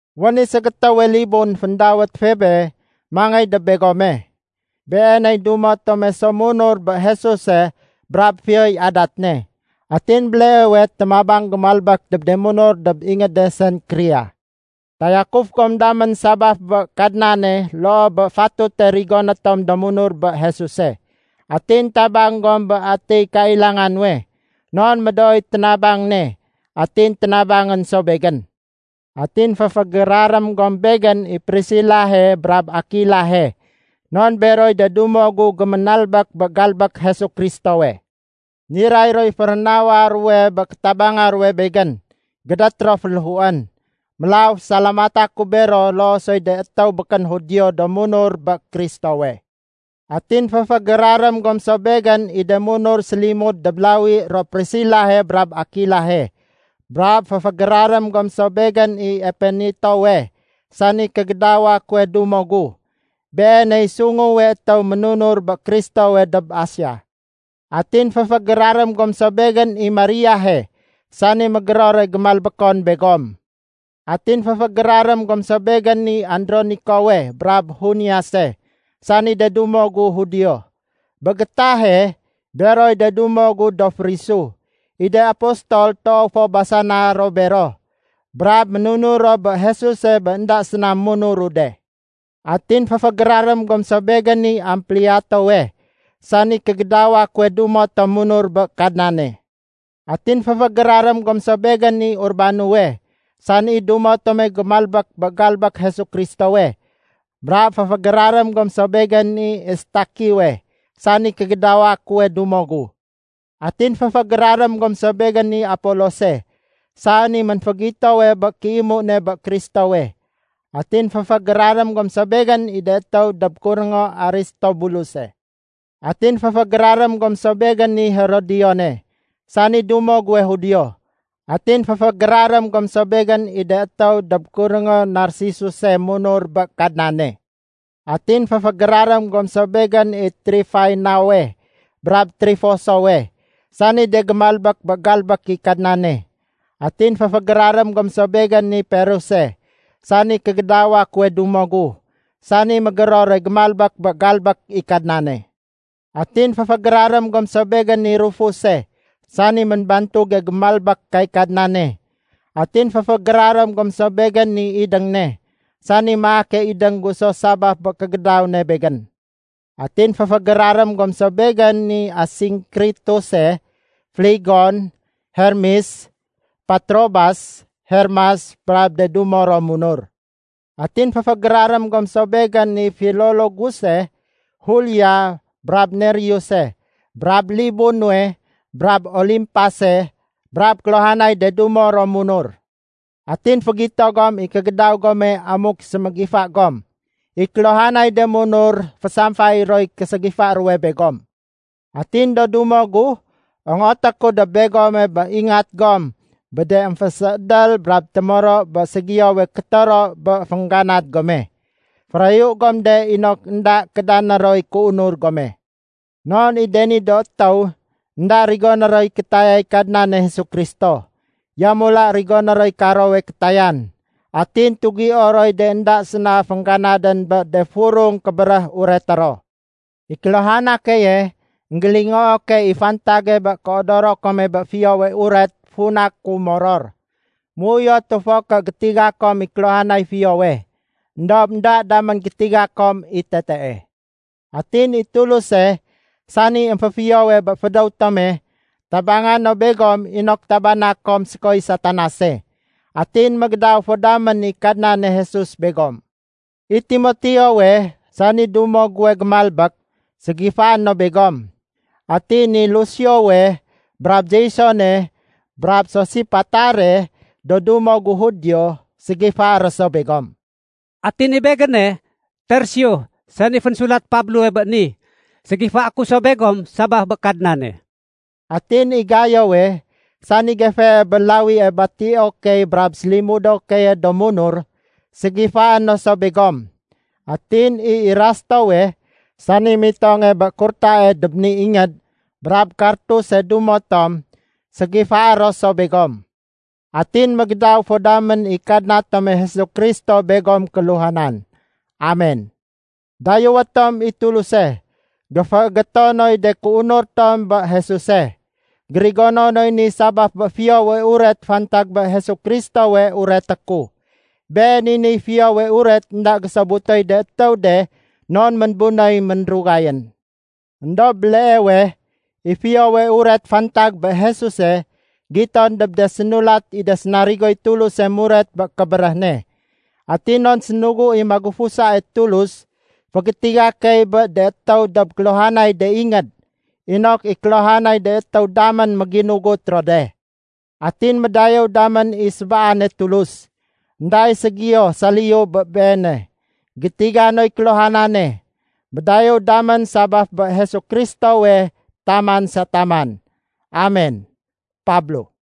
Wén i ségétéwe libun féndawét Febe mangéy dob begome. Beeney dumo tome so munur bé Jesuse brab fiyoy adat ne. Atin béleewe témabang gémalbek dob de munur dob ingéde Senkrea. Tayakuf gom damén sabaf bé Kadnane loo bé fatute rigoné tom do munur bé Jesuse. Atin tabang gom bé atiy kailanga nuwe, non médooy ténabang ne, atin ténabangén so begén. Atin féfégérarém gom begén i Prisilahe brab Akilahe. Non beroy de dumo gu géménalbék bé galbék Jesu Kristowe. Niray roy férénawa ruwe bé kétabanga ruwe begén, gédét ro féléhuén. Mélaw fésalamata ku bero loo soy de étéw békén Judio do munur bé Kristowe. Atin féfégérarém gom so begén i de munur sélimud dob lawi ro Prisilahe brab Akilahe. Brab féfégérarém gom so begén i Epenetowe, sani kégédawa kuwe dumo gu. Beeney sunguwe étéw ménunur bé Kristowe dob Asia. Atin féfégérarém gom so begén i Mariahe, sani mégérore gémalbékon begom. Atin féfégérarém gom so begén i Andronikowe brab Juniase, sani de dumo gu Judio. Bé gétahe, beroy de dumo gu do férisu. I de apostol toow fo basana ro bero, brab ménunur ro bé Jesuse bé énda séna munuru de. Atin féfégérarém gom so begén i Ampliatowe, sani kégédawa kuwe dumo tom munur bé Kadnane. Atin féfégérarém gom so begén i Urbanowe, sani dumo tome gémalbék bé galbék Jesu Kristowe. Brab féfégérarém gom so begén i Estakiwe, sani kégédawa kuwe dumo gu. Atin féfégérarém gom so begén i Apolose, sani ménfégitowe bé kéimu ne bé Kristowe. Atin féfégérarém gom so begén i de étéw dob kuréngo Aristobuluse. Atin féfégérarém gom so begén i Herodione, sani dumo guwe Judio. Atin féfégérarém gom so begén i de étéw dob kuréngo Narsisuse munur bé Kadnane. Atin féfégérarém gom so begén i Trifaenawe brab Trifosowe, sani de gémalbék bé galbék i Kadnane. Atin féfégérarém gom so begén i Peruse, sani kégédawa kuwe dumo gu, sani mégérore gémalbék bé galbék i Kadnane. Atin féfégérarém gom so begén i Rufuse, sani ménbantuge gémalbék kay Kadnane. Atin féfégérarém gom so begén i idéng ne, sani maake idéng gu so sabaf bé kégédaw ne begén. Atin féfégérarém gom so begén i Asinkrituse, Flegon, Hermes, Patrobas, Hermas, brab de dumo ro munur. Atin féfégérarém gom so begén i Filologuse, Julia, brab Nereuse, brab libu nuwe brab Olimpase brab kéluhanay de dumo ro munur. Atin fégito gom i kégédaw gome amuk sémégifa gom. I kéluhanay de munur fésamfayé roy késégifa ruwe begom. Atin do dumo gu, ongoté ku dob begome bé ingat gom bé de émféséédél brab témoro bé ségiyowe kétoro bé féngganad gome. Férayu gom de inok énda kédané roy kéunur gome. Non i de ni do étéw, énda rigoné roy kétayay Kadnane Jesu Kristo. Yamula rigoné roy karowe kétayan. Atin tugio roy de énda séna féngganadén bé de furung kébéréh ureté ro. I kéluhana keye, énggélingoo key i fantage bé kéodoro kome bé Fiyowe Uret funa ku moror. Méuyotu fo ké gétiga kom i kéluhanay fiyowe. Endob énda damén gétiga kom i tetee. Atin i Tuluse, sani émféfiyowe bé fédéw tome, tabanga no begom inok tabana kom sékoy Satanase. Atin mégédaw fo damén i Kadnane Jesus begom. I Timoteowe, sani dumo guwe gémalbék, ségifaé no begom. Atin i Lusiowe brab Jasone brab Sosipatare do dumo gu Judio, ségifaé ro so begom. Atin i begéne, Tersio sani fénsulat Pablowe bé ni, ségifaé ku so begom sabaf bé Kadnane. Atin i Gayowe, sani gefee bé lawie batio key brab sélimudo keye do munur, ségifaé no so begom. Atin i Erastowe, sani mitonge bé kurtae dob ni ingéd, brab Kartuse dumo tom, ségifaé ro so begom. Atin mégédaw fo damén i Kadna tome Jesu Kristo begom kéluhanan. Amen. Dayéwé tom i Tuluse. Géféégéto noy de kéunur tom bé Jesuse. Gérigono noy ni sabaf bé Fiyowe Uret fantag bé Jesu Kristowe ureté ku. Been i niy Fiyowe Uret énda gésobutoy de étéw de non ménbunéy ménrugayén. Endob béleewe, i Fiyowe Uret fantag bé Jesuse giton dob de sénulat i de sénarigoy Tuluse muret bé kébéréh ne. Atin non sénugu i magufusae Tulus, fégétiga key bé de étéw dob kéluhanay de ingéd, inok i kéluhanay de étéw damén méginugut ro de. Atin médayéw damén i sébaane Tulus. Enda i ségiyo saliyu bé Beene. Gétiga noy kéluhanane. Médayéw damén sabaf bé Jesu Kristowe taman sa taman. Amen. Pablo